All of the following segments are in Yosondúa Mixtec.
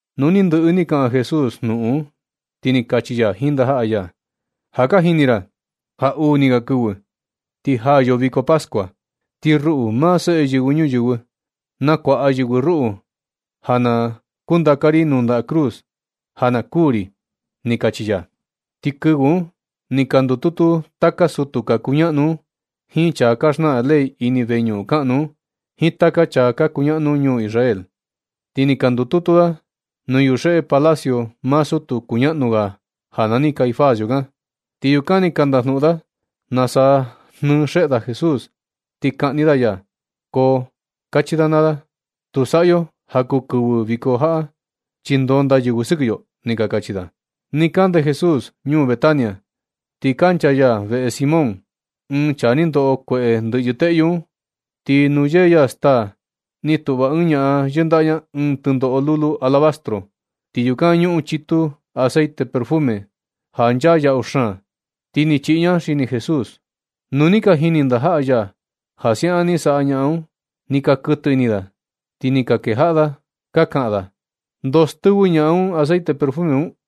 Nu ni ndɨꞌɨ ni kaꞌan Jesús jnuꞌun un, ti ni kachi ya jiin ndajaꞌa ya: ―Ja ka jini ra ja uu ni ga kɨvɨ, ti jaa yo viko pascua. Ti ruꞌu, maa Seꞌe Yɨvɨ Ñuyɨvɨ, nakuaꞌa yɨvɨ ruꞌu ja na kundaka ri nuu ndaꞌa cruz ja na kuū ri ―ni kachi ya. Ti kɨvɨ un ni ka ndututu taka sutu ka kuñaꞌnu un jiin chaa ka xnaꞌan ley ini veñuꞌun kaꞌnu un, jiin taka chaa ka kuñaꞌnu ñuu Israel. Ti ni ka ndututu da nuu yuxeꞌe palacio maa sutu kuñaꞌnu ga, ja nani Caifás yukan. Ti yukan ni ka ndajnuꞌun da nasa jnɨɨ xeꞌe da Jesús, ti kaꞌni da ya. Ko kachi da naa da: ―Tu saꞌa yo ja kuu kɨvɨ viko jaꞌa, chi ndonda yɨvɨ sɨkɨ yo ―ni ka kachi da. Nɨ kande Jesús ñuu Betania, ti kancha ya veꞌe Simón, ɨɨn chaa ni ndoꞌo kueꞌe ndɨꞌyɨ teꞌyu un. Ti nuu yee ya staa, ni tuꞌva ɨɨn ñaꞌan yɨndaꞌa ña ɨɨn tɨndoꞌo lulu alabastro, ti yukan ñuꞌun chitu aceite perfume ja nchaa yaꞌu xaan. Ti ni chiꞌi ña xini Jesús. Nu ni ka jini ndajaꞌa ya ja siaꞌan ni saꞌa ñaꞌan un, ni ka kɨtɨ ini da, ti ni ka kejaꞌa da ka kaꞌan da: ―¿Ndoo stɨvɨ ñaꞌan un aceite perfume un?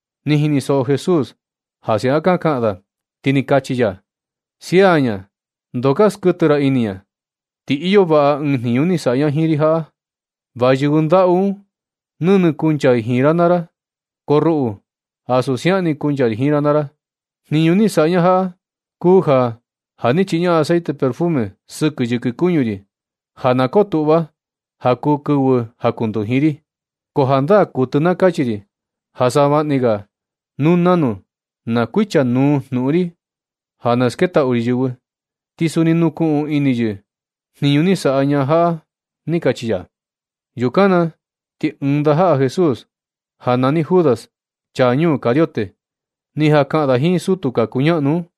Ni jinisoꞌo Jesús ja siaꞌan ka kaꞌan da, ti ni kachi ya: ―Sia ña, ndoo ka skuɨtɨ ra ini ña. Ti iyo vaꞌa ɨɨn jniñu ni saꞌa ña jiin ri jaꞌa. Va yɨvɨ ndaꞌu un nɨnɨ kancha i jiin ra naa ra, ko ruꞌu, ansu siaꞌan ni kuncha ri jiin ra naa ra. Jniñu ni saꞌa ña jaꞌa, kuu ja, ja ni chiꞌi ña aceite perfume sɨkɨ yɨkɨ kuñu ri ja na kotuꞌva ja kuu kɨvɨ jakunduji ri. Ko jandaa kuɨtɨ na kachi ri ja savaꞌni ga nu nanu na kuichanuu jnuꞌun ri ja na sketaꞌu ri yɨvɨ, ti suni nukuꞌun ini yɨ jniñu ni saꞌa ñaꞌan jaꞌa ―ni kachi ya. Yukan na ti ɨɨn ndajaꞌa Jesús nani Judas, chaa ñuu Cariote, ni jan kaꞌan da jiin sutu ka kuñaꞌnu un,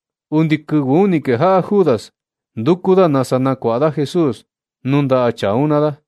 Undi kɨvɨ un ni kejaꞌa Judas nduku da nasa nakuaꞌa da Jesús nuu ndaꞌa chaa un naa da.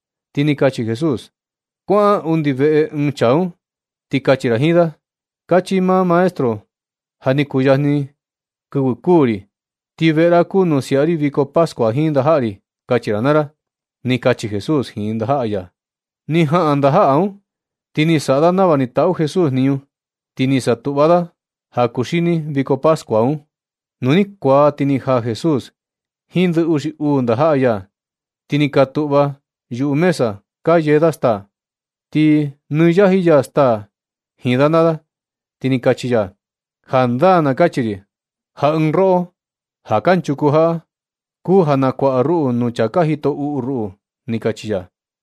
Ti ni kachi Jesús: ―Kuaꞌan undi nuu veꞌe ɨɨn chaa un, ti kachi ra jiin da: “Kachi maa Maestro na. Ja ni kuyajni kɨvɨ kuū ri, ti veꞌe ra kuu nuu siaꞌa ri viko pascua jiin ndajaꞌa ri”, kachi ra naa ra ―ni kachi Jesús jiin ndajaꞌa ya. Ni jaꞌan ndajaꞌa un, ti ni ka saꞌa da nava ni taꞌu Jesús jniñu, ti ni ka satuꞌva da ja kuxini viko pascua un. Nu ni kuaa ti ni jaa Jesús jiin ndɨ uxi uu ndajaꞌa ya, ti ni ka tuꞌva yuꞌu mesa ka yee da staa. Ti nɨ yaji ya staa jiin da naa da, ti ni kachi ya: ―Jandaa na kachi ri, ja ɨɨn roꞌo ja kanchuku jaꞌa, kuu ja nakuaꞌa ruꞌu nuu chaa ka jito uꞌu ruꞌu ―ni kachi ya.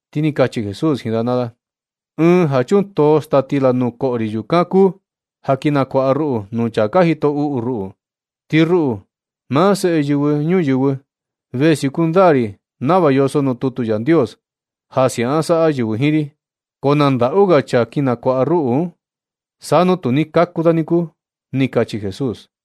Ti ni kachi Jesús jiin da naa da: ―Ɨɨn ja chuntoo staa stila nuu koꞌo ri, yukan kuu ja kin nakuaꞌa ruꞌu nuu chaa ka jito uꞌu ruꞌu. Ti ruꞌu, maa Seꞌe Yɨvɨ Ñuyɨvɨ, ve siuku ndaa ri nava yoso nuu tutu Yandios ja siaꞌan saꞌa yɨvɨ jiin ri, ko na ndaꞌu ga chaa kin nakuaꞌa ruꞌu un. Sa nu tu ni kaku da niku ―ni kachi Jesús.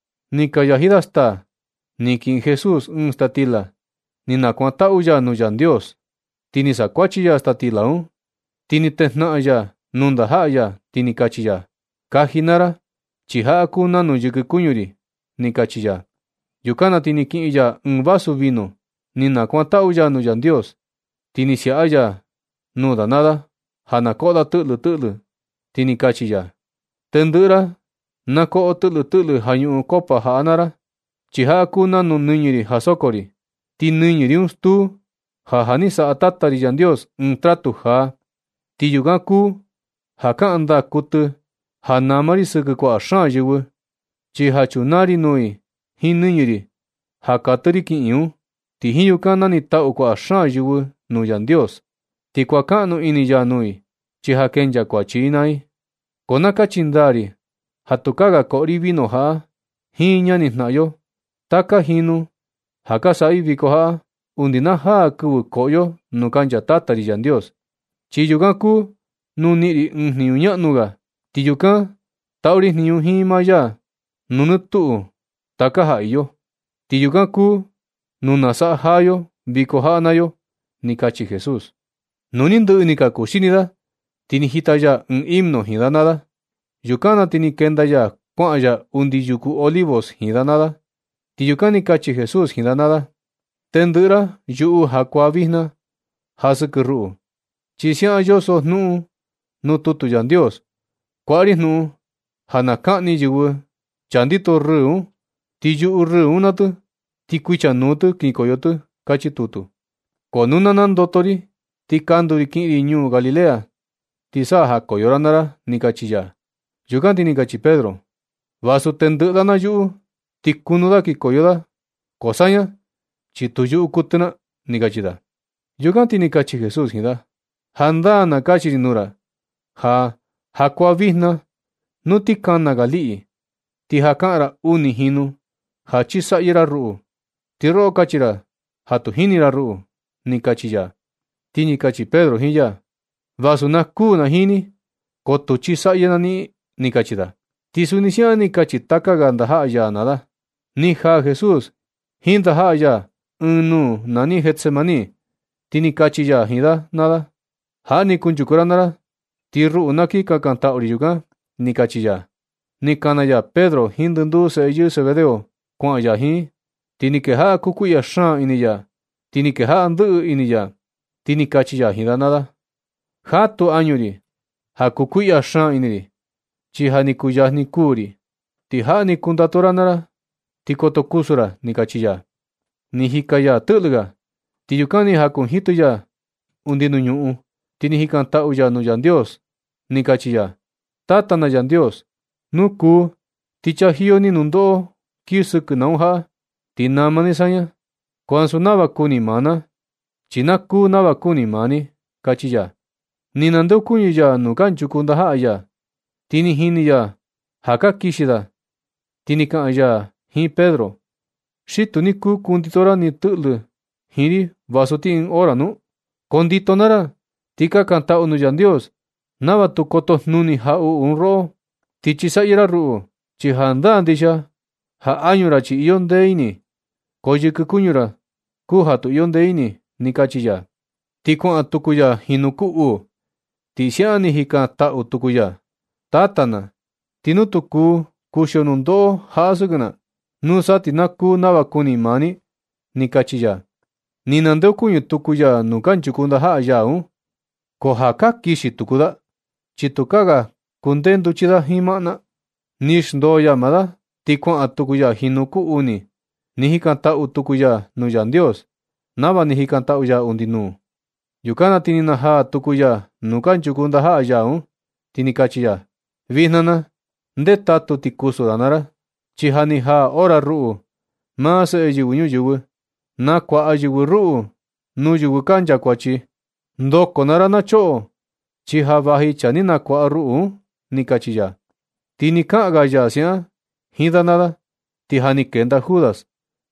Ni ka yaji da staa, ni kiꞌin Jesús ɨɨn staa stila, ni nakuantaꞌu ya nuu Yandios, ti ni sakuachi ya staa stila un, ti ni tejnaꞌan ya nuu ndajaꞌa ya, ti ni kachi ya: ―Kaji naa ra, chi jaꞌa kuu nanu yɨkɨ kuñu ri ―ni kachi ya. Yukan na ti ni kiꞌin ya ɨɨn vasu vino, ni nakuantaꞌu ya nuu Yandios, ti ni siaꞌa ya nuu da naa da ja koꞌo da tɨꞌlɨ tɨꞌlɨ, ti ni kachi ya: ―Tendɨꞌɨ ra na koꞌo tɨꞌlɨ tɨꞌlɨ ja ñuꞌun copa jaꞌa naa ra, chi jaꞌa kuu nanu nɨñɨ ri ja soko ri. Ti nɨñɨ ri un stuu ja, ja ni saꞌa Tata ri Yandios ɨɨn tratu jaa. Ti yukan kuu ja kaꞌan ndaa kuɨtɨ ja nama ri sɨkɨ kuaꞌa xaan yɨvɨ. Chi ja chunaa ri nuu i jiin nɨñɨ ri ja katɨ ri kiꞌin un. Ti jiin yukan nanitaꞌu kuaꞌa xaan yɨvɨ nuu Yandios. Ti kuankaꞌnu ini ya nuu i, chi ja kenchaa kuachi i naa i. Ko na kachi ndaa ri ja tukaa ga koꞌo ri vino jaꞌa jiin ñanijnaꞌan yo taka jinu ja ka nasaꞌa i viko jaꞌa, undi na jaa kɨvɨ koꞌo yo nuu kancha Tata ri Yandios, chi yukan kuu nuu niꞌin ri ɨɨn jniñu ñaꞌnu ga. Ti yukan taꞌu ri jniñu jiin maa ya nuu nɨ tuꞌu taka ja iyo. Ti yukan kuu nuu nasaꞌa jaa yo viko jaꞌa naa yo ―ni kachi Jesús. Nu ni ndɨꞌɨ ni ka kuxini da, ti ni jita ya ɨɨn himno jiin da naa da. Yukan na ti ni kenda ya kuaꞌan ya undi yuku Olivos jiin da naa da, ti yukan ni kachi Jesús jiin da naa da: ―Tendɨꞌɨ ra yuꞌu jakuaa vijna ja sɨkɨ ruꞌu, chi siaꞌan yoso jnuꞌun un nuu tutu Yandios: “Kuaꞌa ri jnuꞌun ja na kaꞌni yɨvɨ chaa ndito rɨɨ un, ti yuꞌu rɨɨ un naa tɨ, ti kuichanuu tɨ kinkoyo tɨ”, kachi tutu. Ko nu na nandoto ri, ti kandu ri kiꞌin ri ñuu Galilea, ti sa jakoyo ra naa ra ―ni kachi ya. Yukan ti ni kachi Pedro: ―Vasu tendɨꞌɨ da na yuꞌu, ti kunu da kinkoyo da ko saña, chi tu yuꞌu kuɨtɨ na ―ni kachi da. Yukan ti ni kachi Jesús jiin da: ―Jandaa na kachi ri nuu ra ja, jakuaa vijna nu ti kana ga liꞌi, ti ja kaꞌan ra uni jinu ja chisaꞌyɨ ra ruꞌu, ti roꞌo kachi ra ja tu jini ra ruꞌu ―ni kachi ya. Ti ni kachi Pedro jiin ya: ―Vasu na kuū na jiin ni, ko tu chisaꞌyɨ na niꞌin ―ni kachi da. Ti suni siaꞌan ni ka kachi taka ga ndajaꞌa ya naa da. Ni jaa Jesús jiin ndajaꞌa ya ɨɨn nuu nani Getsemaní, ti ni kachi ya jiin da naa da: ―Jaꞌa ni kunchuku ra naa ra, ti ruꞌu na kin kakantaꞌu ri yukan ―ni kachi ya. Ni kana ya Pedro jiin ndɨnduu seꞌe yɨɨ Zebedeo kuaꞌan ya jiin, ti ni kejaꞌa kukuiꞌya xaan ini ya, ti ni kejaꞌa ndɨꞌɨ ini ya. Ti ni kachi ya jiin da naa da: ―Jatu añu ri ja kukuiꞌya xaan ini ri, chi ja ni kuyajni kuu ri. Ti jaꞌa ni kundatu ra naa ra ti koto kusu ra ―ni kachi ya. Ti ni jika ya tɨꞌlɨ ga. Ti yukan ni jankunjitɨ ya undi nuu ñuꞌun, ti ni jikantaꞌu ya nuu Yandios, ni kachi ya: ―Tata na Yandios, nu kuu ti chajiyo ni nundoꞌo kii sɨkɨ na un jaꞌa, ti nama ni saña. Ko ansu nava kuni maa na, chi na kuu nava kuni maa ni ―kachi ya. Ni nandeokuñɨ ya nuu kanchuku ndajaꞌa ya, ti ni jini ya ja ka kixi da, ti ni kaꞌan ya jiin Pedro: ―¿Xi tu ni kuu kundito ra tɨꞌlɨ jiin ri vasu ti ɨɨn hora nu? Kondito naa ra, ti kakantaꞌu nuu Yandios nava tu kotojnuni jaꞌuꞌu un roꞌo, ti chisaꞌyɨ ra ruꞌu. Chi jandaa ndixia ja añu ra, chi iyo ndee ini, ko yɨkɨ kuñu ra kuu ja tu iyo ndee ini ―ni kachi ya. Ti kuaꞌan tuku ya jinu kuu uu, ti siaꞌan ni jikantaꞌu tuku ya: ―Tata na, ti nu tu kuu kuxio nundoꞌo jaꞌa sɨkɨ na, nusa ti na kuu nava kuni maa ni ―ni kachi ya. Ni nandeokuñɨ tuku ya nuu kanchuku ndajaꞌa ya un, ko ja ka kixi tuku da, chi tukaa ga kundee nduchi da jiin maꞌna. Ni xndoo ya maa da, ti kuaꞌan tuku ya jinu kuu uni ni jikantaꞌu tuku ya nuu Yandios, nava ni jikantaꞌu ya undi nuu. Yukan na ti ni najaa tuku ya nuu kanchuku ndajaꞌa ya un, ti ni kachi ya: ―Vijna na, ndetatu ti kusu naa ra. Chi ja ni jaa hora ja ruꞌu, maa Seꞌe Yɨvɨ Ñuyɨvɨ, nakuaꞌa yɨvɨ ruꞌu nuu yɨvɨ ka nchakuachi. Ndoko naa ra na choꞌo, chi ja vaji chaa ni nakuaꞌa ruꞌu un ―ni kachi ya. Ti nɨ kaꞌan ga ya siaꞌan jiin da naa da, ti ja ni kenda Judas,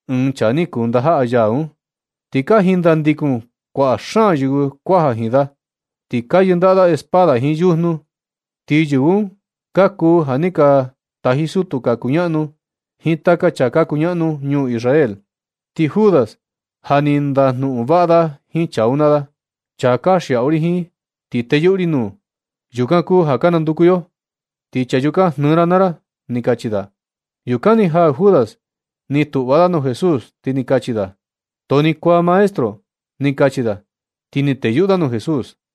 ɨɨn chaa ni kuu ndajaꞌa ya un. Ti ka jindandikun kuaꞌa xaan yɨvɨ kuaja jiin da, ti ka yɨndaꞌa espada jiin yujnu. Ti yɨvɨ un ka kuu ja ni ka taji sutu ka kuñaꞌnu jiin taka chaa ka kuñaꞌnu nuu ñuu Israel. Ti Judas ja ni ndajnuꞌun vaꞌa da jiin chaa un naa da: ―Chaa kanxiaꞌu ri jiin, ti teyuꞌu ri nuu, yukan kuu ja ka nanduku yo. Ti chaa yukan jnɨɨ ra naa ra ―ni kachi da. Yukan ni jaa Judas, ni tuꞌva da nuu Jesús, ti ni kachi da: ―Too ni kuaa, maestro ―ni kachi da. Ti ni teyuꞌu da nuu Jesús.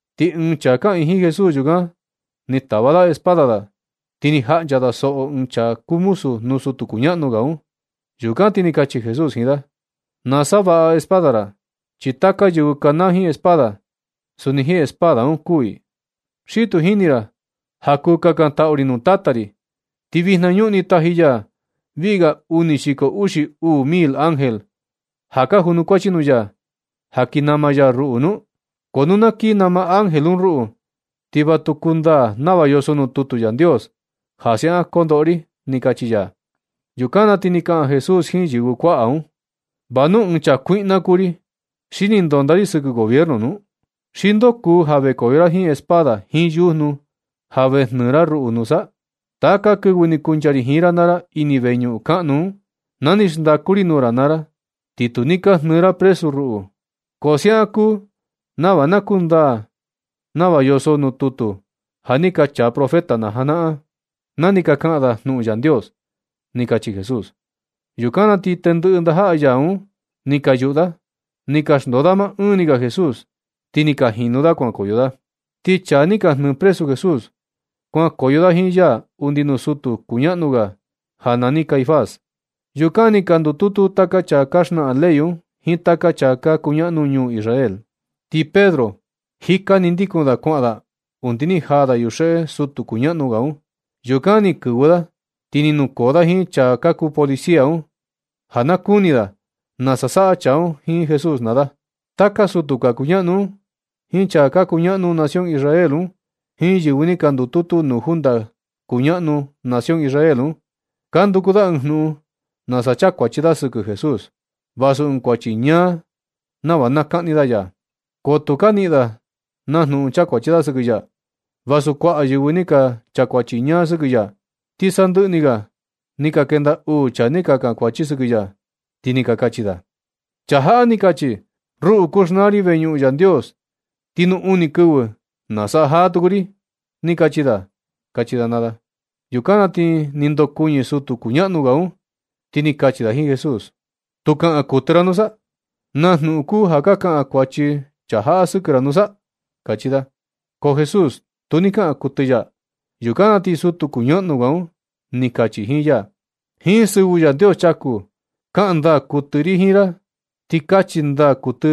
Ti ɨɨn chaa kaꞌiin jiin Jesús yukan, ni tava da espada da, ti ni jaꞌncha da soꞌo ɨɨn chaa kuu muzu nuu sutu kuñaꞌnu ga un. Yukan ti ni kachi Jesús jiin da: ―Na savaꞌa espada ra. Chi taka yɨvɨ kanaa jiin espada, suni jiin espada un kuū i. ¿Xi tu jini ra ja kuu kakantaꞌu ri nuu Tata ri, ti vijna ñuꞌni taji ya viꞌi ga uni xiko uxi uu mil ángel ja ka junukuachi nuu ya, ja na kii nama ya ruꞌu nu? Ko nu na kii nama ángel un ruꞌu, ti va tu kuu kundaa nava yoso nuu tutu Yandios ja siaꞌan kondoꞌo ri ―ni kachi ya. Yukan na ti ni kaꞌan Jesús jiin yɨvɨ kuaꞌa un: ―¿Va nu ɨɨn chaa kuiꞌna kuu ri, xi ni ndonda ri sɨkɨ gobierno nu? ¿Xi ndoo kuu ja vekoyo ra jiin espada jiin yujnu ja ve jnɨɨ ra ruꞌu nusa? Taka kɨvɨ ni kuncha ri jiin ra naa ra ini veñuꞌun kaꞌnu un, na ni xndaku ri nuu ra naa ra, ti tu ni ka jnɨɨ ra presu ruꞌu. Ko siaꞌan kuu nava na kundaa nava yoso nuu tutu ja ni ka chaa profeta najanaꞌan, na ni ka kaꞌan da jnuꞌun Yandios ―ni kachi Jesús. Yukan na ti tendɨꞌɨ ndajaꞌa ya un ni ka yuꞌu da, ni ka xndoo da maꞌɨɨn ni ga Jesús, ti ka jinu da kuankoyo da. Ti chaa ni ka jnɨɨ presu Jesús, kuankoyo da jiin ya undi nuu sutu kuñaꞌnu ga nani Caifás. Yukan ni ka ndututu taka chaa ka xnaꞌan ley un jiin taka chaa ka kunaꞌnu ñuu Israel. Ti Pedro jika ni ndikun da kuaꞌan da undi ni jaa da yuxeꞌe sutu kuñaꞌnu ga un. Yukan ni kɨvɨ da, ti ni nukoo da jiin chaa ka kuu policia un, ja na kuni da nasa saꞌa chaa un jiin Jesús naa da. Taka sutu ka kuñaꞌnu un jiin chaa ka kuñaꞌnu nación Israel un, jiin yɨvɨ ni ka ndututu nuu junta kuñaꞌnu nación Israel un, ka nduku da ɨɨn jnuꞌun nasa chakuachi da sɨkɨ Jesús, vasu ɨɨn kuachi ñaa, nava na kaꞌni da ya. Ko tu ni ka niꞌin da na jnuꞌun chakuachi da sɨkɨ ya, vasu kuaꞌa yɨvɨ ni ka chakuachi ñaa sɨkɨ ya. Ti sandɨꞌɨ ni ga ni ka kenda uu chaa ni ka chakuachi sɨkɨ ya, ti ni ka kachi da: ―Chaa jaꞌa ni kachi: “Ruꞌu, kuu xnaa ri veñuꞌun Yandios, ti nuu uni kɨvɨ ti nasaꞌa jaa tuku ri”, ni kachi da ―kachi da naa da. Yukan na ti ni ndokuɨñɨ sutu kuñaꞌnu ga un, ti ni kachi da jiin Jesús: ―¿Tu kaꞌan kuɨtɨ ra nusa? ¿Naa jnuꞌun kuu ja ka kaꞌan kuachi chaa jaꞌa sɨkɨ ra nusa? ―kachi da. Ko Jesús tu ni kaꞌan kuɨtɨ ya. Yukan na ti sutu kuñaꞌnu ga un ni kachi jiin ya: ―Jiin sɨvɨ Yandios chaku, kaꞌan ndaa kuɨtɨ ri jiin ra, ti kachi ndaa kuɨtɨ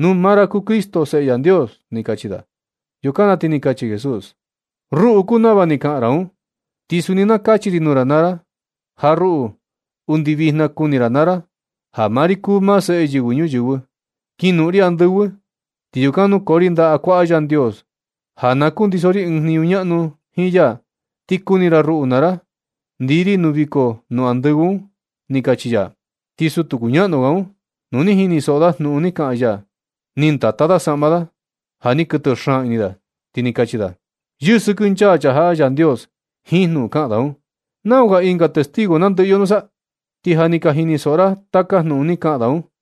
nu maa ra kuu Cristo, Seꞌe Yandios ―ni kachi da. Yukan na ti ni kachi Jesús: ―Ruꞌu kuu nava ni kaꞌan ra un. Ti suni na kachi ri nuu ra naa ra ja ruꞌu, undi vijna kuni ra naa ra ja maa ri kuu maa Seꞌe Yɨvɨ Ñuyɨvɨ, kinoꞌon ri andɨvɨ, ti yukan nukoo ri ndaꞌa kuaꞌa Yandios ja na kundiso ri ɨɨn jniñu ñaꞌnu jiin ya, ti kuni ra ruꞌu naa ra ndii ri nuu viko nuu andɨvɨ un ―ni kachi ya. Ti sutu kuñaꞌnu ga un, nu ni jinisoꞌo da jnuꞌun ni kaꞌan ya, ni ndata da saꞌma da ja ni kɨtɨ xaan ini da, ti ni kachi da: ―¡Yɨsɨkɨnchaa chaa jaꞌa Yandios jiin jnuꞌun kaꞌan da un! ¿Nau ga ɨnga testigo nandɨꞌɨ yo nusa? Ti ja ni ka jinisoꞌo ra taka jnuꞌun ni kaꞌan da un.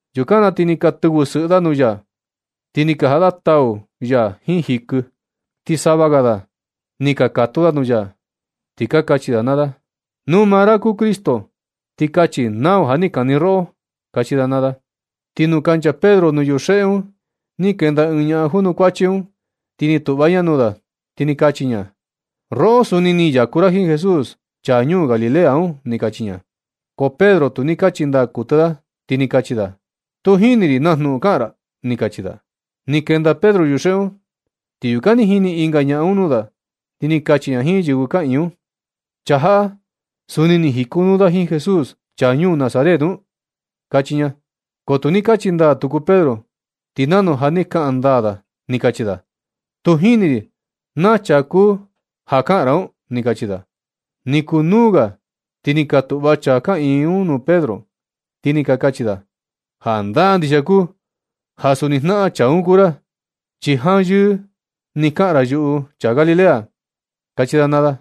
Yukan na ti ni ka tɨvɨ sɨꞌɨ da nuu ya, ti ni ka jaꞌa da tau ya jiin jikɨ. Ti sava ga da ni ka katu da nuu ya, ti ka kachi da naa da: ―Nu maa ra kuu Cristo, ti kachi nau ja ni kani roꞌo ―kachi da naa da. Ti nu kancha Pedro nuu yuxeꞌe un, ni kenda ɨɨn ñaꞌan junukuachi un, ni tuꞌva ña nuu da, ti ni kachi ña: ―Roꞌo, suni ni yaku ra jiin Jesús, chaa ñuu Galilea un ―ni kachi ña. Ko Pedro tu ni kachi ndaa kuɨtɨ da, ti ni kachi da: ―Tu jini ri naa jnuꞌun kaꞌan ra ―ni kachi da. Ni kenda Pedro yuxeꞌe un, ti yukan ni jini ɨnga ñaꞌan un nuu da, ti ni kachi ña jiin yɨvɨ kaꞌiin un: ―Chaa jaꞌa, suni ni jikonuu da jiin Jesús, chaa ñuu Nazaret un ―kachi ña. Ko tu ni kachi ndaa tuku Pedro, ti nanu ja ni kaꞌan ndaa da, ni kachi da: ―Tu jini ri naa chaa kuu ja kaꞌan ra un ―ni kachi da. Ni kuu nuu ga, ti ni ka tuꞌva chaa kaꞌiin un nuu Pedro, ti ni ka kachi da: ―Jandaa ndixia kuu ja suni jnaꞌan chaa un kuu ra, chi janyɨɨ ni kaꞌan ra yuꞌu chaa Galilea ―kachi da naa da.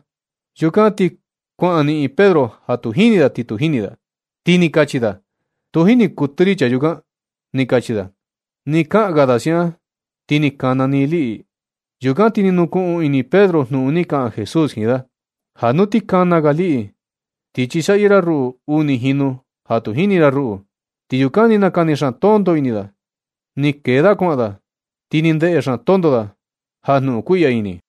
Yukan ti kuan niꞌin Pedro ja tu jini da, ti tu jini da, ti ni kachi da: ―Tu jini kuɨtɨ ri chaa yukan ―ni kachi da. Ti nɨ kaꞌan ga da siaꞌan, ni kana ni ɨɨn liꞌi. Yukan ti ni nukuꞌun ini Pedro jnuꞌun ni kaꞌan Jesús jiin da: “Ja nu ti kana ga liꞌi, ti chisaꞌyɨ ra ruꞌu uni jinu ja tu jini ra ruꞌu.” Ti yukan ni nakani xaan tonto ini da, ni kenda da kuaꞌan da, ti ni ndeꞌe xaan tonto da ja jnuꞌun kuiꞌya ini.